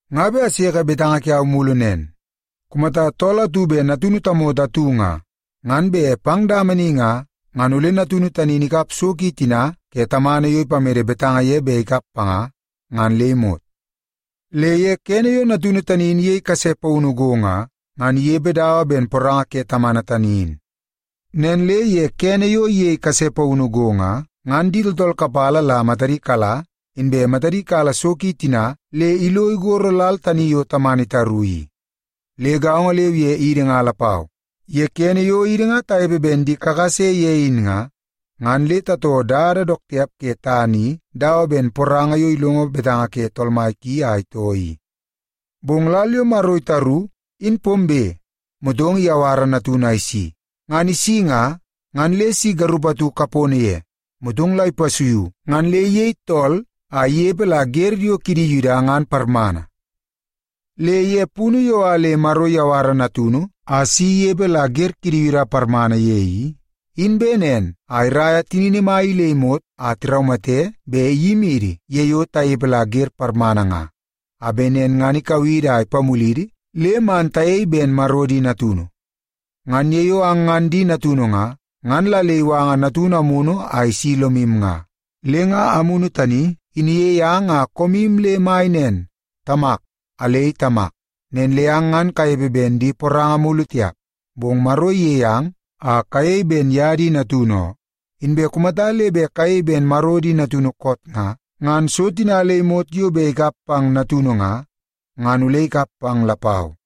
Nga bet aseke betanga kiau mulu nen. Kumata tool atu bet natunu tamoto atu nga, ngan bet pang dama ni nga, ngan ole natunu tani in ikap so tina ke tamana yo ipamede betanga ye bet ikap panga, ngan le imot. Le ye kene yo natunu tani in iyei kase paunu go nga, ngan inepe dawa ben poranga ke tamana tani in. Nen le ye kene yo iyei kase paunu go nga, ngan di tooltool kapala la matadi kala, inbe matadi kala so ki tina le lo igoro lal tani yo tamana itaru i. Le gaongo leu ye idi nga lapau, ye kene yo idi nga tanepe ben di kakase ye in nga, ngan le tatoo dada dook tiap ke tana i dawa ben poranga yo ilongo betanga ke tool mai ki a itoo i. Bong lal yo Maro itaru, in pombe, motong iyawara Natunu a isi. Ngan isi nga, ngan le si garup atu kapono ye, motong la ipasuiu ngan le iyei tool a inepe la wer yo kidi Yuda ngan parmana. Le ye punu yo a le Maro iyawara Natunu a si inepe la wer kidi Yuda tina parmana ye i, in bet nen a iraia tinini mai i le imot a tiraumate bet iyimidi ye yo tanepe la wer parmana nga, a bet nen ngan ikau idi a ipamulidi le man tayei ben Maro di natunu. Ngan ye yo ang ngan di natunu nga, ngan la le iwanga Natunu Amunu a isi lomu nga. Le nga Amunu tani in iyei ang a koomu le mai nen, “Tamak, alei Tamak.” Nen le ang ngan kanepe ben di poranga mulu tiap, bong Maro iyei ang a kayei ben ye di natunu oo. Inbe kumata le bet kayei ben Maro di natunu koot nga, ngan so tina le imot yo bet ikap pang natunu nga, ngan ole ikap pang lapau.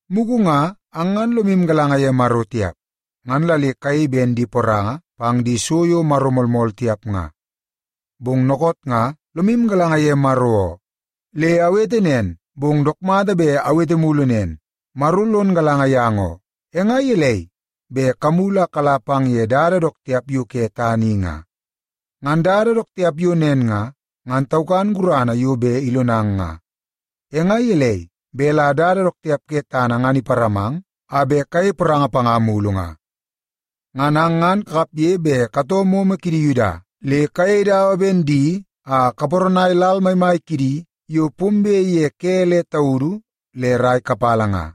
Mugu nga ang ngan lomu galanga ye Maro tiap, ngan la le kayei ben di poranga pang di so yo maro moolmool tiap nga. Bong dookoot nga lomu galanga ye Maro oo. Le awete nen, bong dook mata bet awete mulu nen, Maro lon galanga yang oo. E nga gelei bet kamulu a kala pang ye dada dook tiap yo ke tana i nga? Ngan dada dook tiap yo nen nga, ngan taukan gurana yo bet ilonang nga. E nga gelei bet la dada dook tiap ke tana ngan iparamang a bet kayei poranga panga mulu nga? Ngan ang ngan kakapge bet katoo momo kidi Yuda le kayei dawa ben di a kaparanai lal maimai kidi yo pombe ye ke le taudu le rai kapala nga.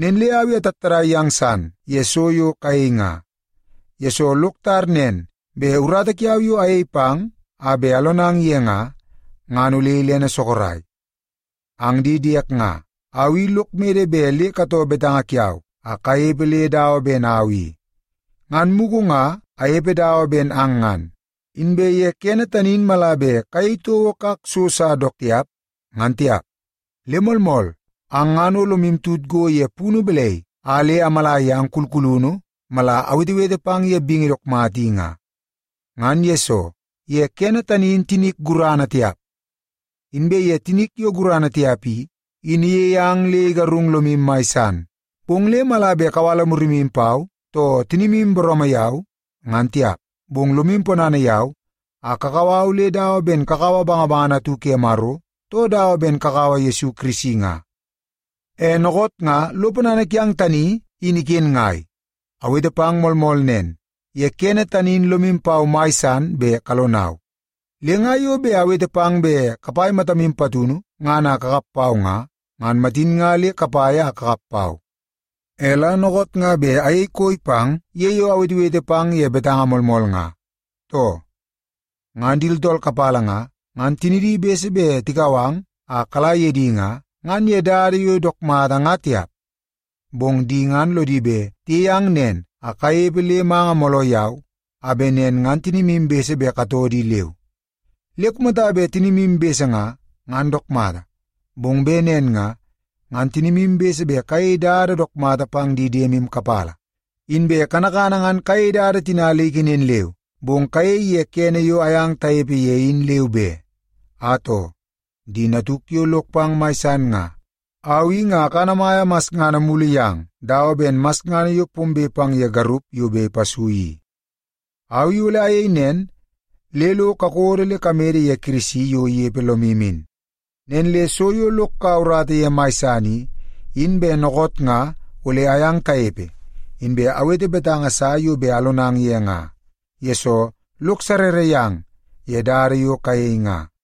Nen le au i atattadai yang san ye so yo kayei nga, yesoo lok tar nen bet urata kiau yo ayei pang a bet alonang ye nga, ngan ole ilene sorok. Ang di diek nga, au i lok mede bet le katoo betanga kiau a kanepe le dawa ben au i. Ngan mugu nga anepe dawa ben ang ngan, inbe ye kene tani in mala bet kayei toko kak so sa dook tiap, ngan tiap. Le moolmool, ang ngan o lomu tut go ye punu balai a le amala yang kulkulunu mala awetewete pang ye bingi dook mata i nga. Ngan yesoo, ye kene tani in tinik gurana tiap. Inbe ye tinik yo gurana tiap i, in iyei ang le igarung lomu mai san. Bong le mala bet kawala murimu pau, too tinimu booroomoo yau, ngan tiap. Bong lomu ponana yau a kakau au le dawa ben kakaua bangabangana atu ke Maro, too dawa ben kakaua Yesu Kirisi nga. E dookoot nga lo ponana kiang tani in iken ngai? Awete pang moolmool nen, ye kene tani in lomu pau mai san bet kalonau. Le nga yo bet awete pang bet kapai matamu patunu ngan a kakap pau nga, ngan matin nga le kapai a kakap pau. E la dookoot nga bet ayei koi pang ye yo awetewete pang ye betanga moolmool nga, too? Ngan di tooltool kapala nga, ngan tinidi bese bet tikau ang a kala ye di nga, ngan ye dada yo dook mata nga tiap. Bong di ngan lodi bet tiyei ang nen a kanepe le manga mooloo yau, a bet nen ngan tinimu bese bet katoo di leu. Le kumata bet tinimu bese nga, ngan dook mata, bong bet nen nga, ngan tinimu bese bet kayei dada dook mata pang di diemu kapala. Inbe kanakana ngan kayei dada tina le ikenen leu, bong kayei ye kene yo ayang tanepe ye in leu be. Atoo, di natuk yo lok pang mai san nga, au i nga akanamaia masngana mulu yang dawa ben masngana yo pombe pang ye garup yo bet ipasui i. Au i ole ayei nen le lo kakodo le kamede ye Kirisi yo inepe lomu in. Nen le so yo lok kaua urata ye mai san i, in bet dookoot nga ole ayang tanepe, inbe awete betanga sa yo bet alonang ye nga, yesoo lok sarrara yang ye dada yo kayei nga.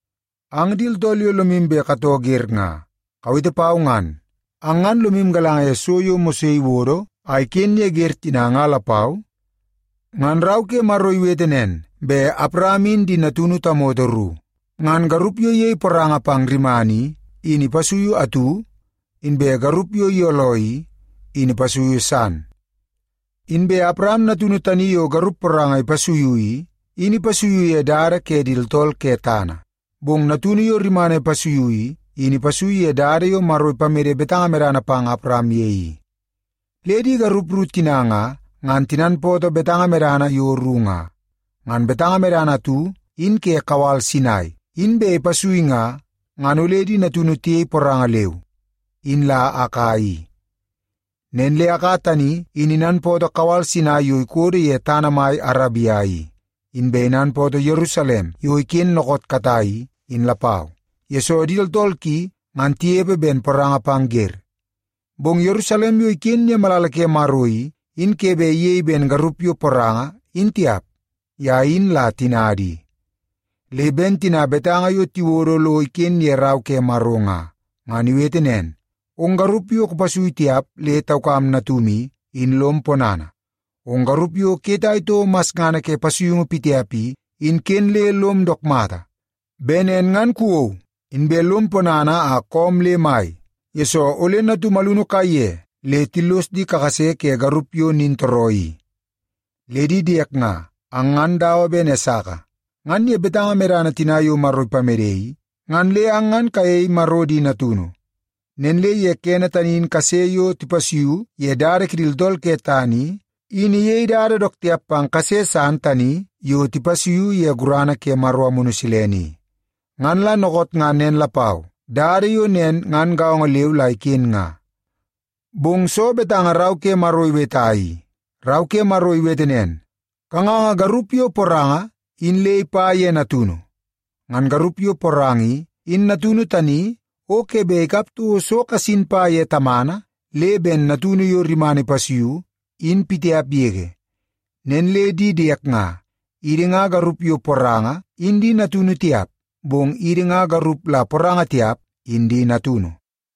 Ang di tooltool yo lomu bet katoo wer nga, kawete pau ngan. Ang ngan lomu galanga ye so yo Mose iwodo a iken ye wer tina nga lapau? Ngan Rau ke Maro iwete nen bet Awaram in di natunu tamoto ru. Ngan garup yo iyei poranga pang rimana i, in ipasuiu atu, inbe garup yo iyooloo i, in ipasuiu san. Inbe Awaram natunu tani yo garup poranga ipasuiu i, in ipasuiu ye dada ke di tooltool ke tana. Bong natunu yo rimana ipasuiu i, in ipasuiu ye dada yo Maro ipamede betanga medana pang Awaram ye i. Le di garup ru tina nga, ngan tinanpootoo betanga medana tina yo ru nga. Ngan betanga medana atu in ke kawal Sinai, in bet ipasui nga, ngan ole di natunu tiyei poranga leu, in la Aka i. Nen le Aka tani in inanpootoo kawal Sinai yo ikodo ye tana mai Arabia i. Inbe inanpootoo Yerusalem yo iken dookoot katai i, in lapau, yesoo di tooltool ki ngan tinepe ben poranga pang wer. Bong Yerusalem yo iken ye malala ke Maro i, in ke bet iyei ben garup yo poranga in tiap. Ye in la tinada i. Le ben betanga tina yo tiwodo lo iken ye Rau ke Maro nga, ngan iwete nen, “Ong garup yo kupasui tiap le taukam natum i, in lom ponana. Ong garup yo kuyetai toko masngana ke pasuiungu pitiap i, in ken le lom dook mata. Bet nen ngan kuwou, inbe lom ponana a koom le mai, yesoo ole natum alunu kaiye le tillos di kakase ke garup yo nintooroo i.” Le di diek nga, ang ngan dawa ben Esaka. Ngan ye betanga medana tani yo Maro ipamede i, ngan le ang ngan kayei Maro di natunu. Nen le ye kene tani in kase yo tipasuiu ye dada kidi tooltool ke tana i, in iyei dada dook tiap pang kase san tani yo tipasuiu ye gurana ke Maro Amunu Silene i. Ngan la dookoot nga nen lapau, dada yo nen ngan gaongo leu la iken nga. Bong soo betanga Rau ke Maro iweta i? Rau ke Maro iwete nen, “Kanganga garup yo poranga in le ipa ye natunu. Ngan garup yo poranga i, in natunu tani o ke bet ikap toko so kasin pa ye tamana le ben natunu yo rimana ipasuiu, in pitiap yege.” Nen le di diek nga, idi nga garup yo poranga in di natunu tiap, bong idi nga garup la poranga tiap in di natunu.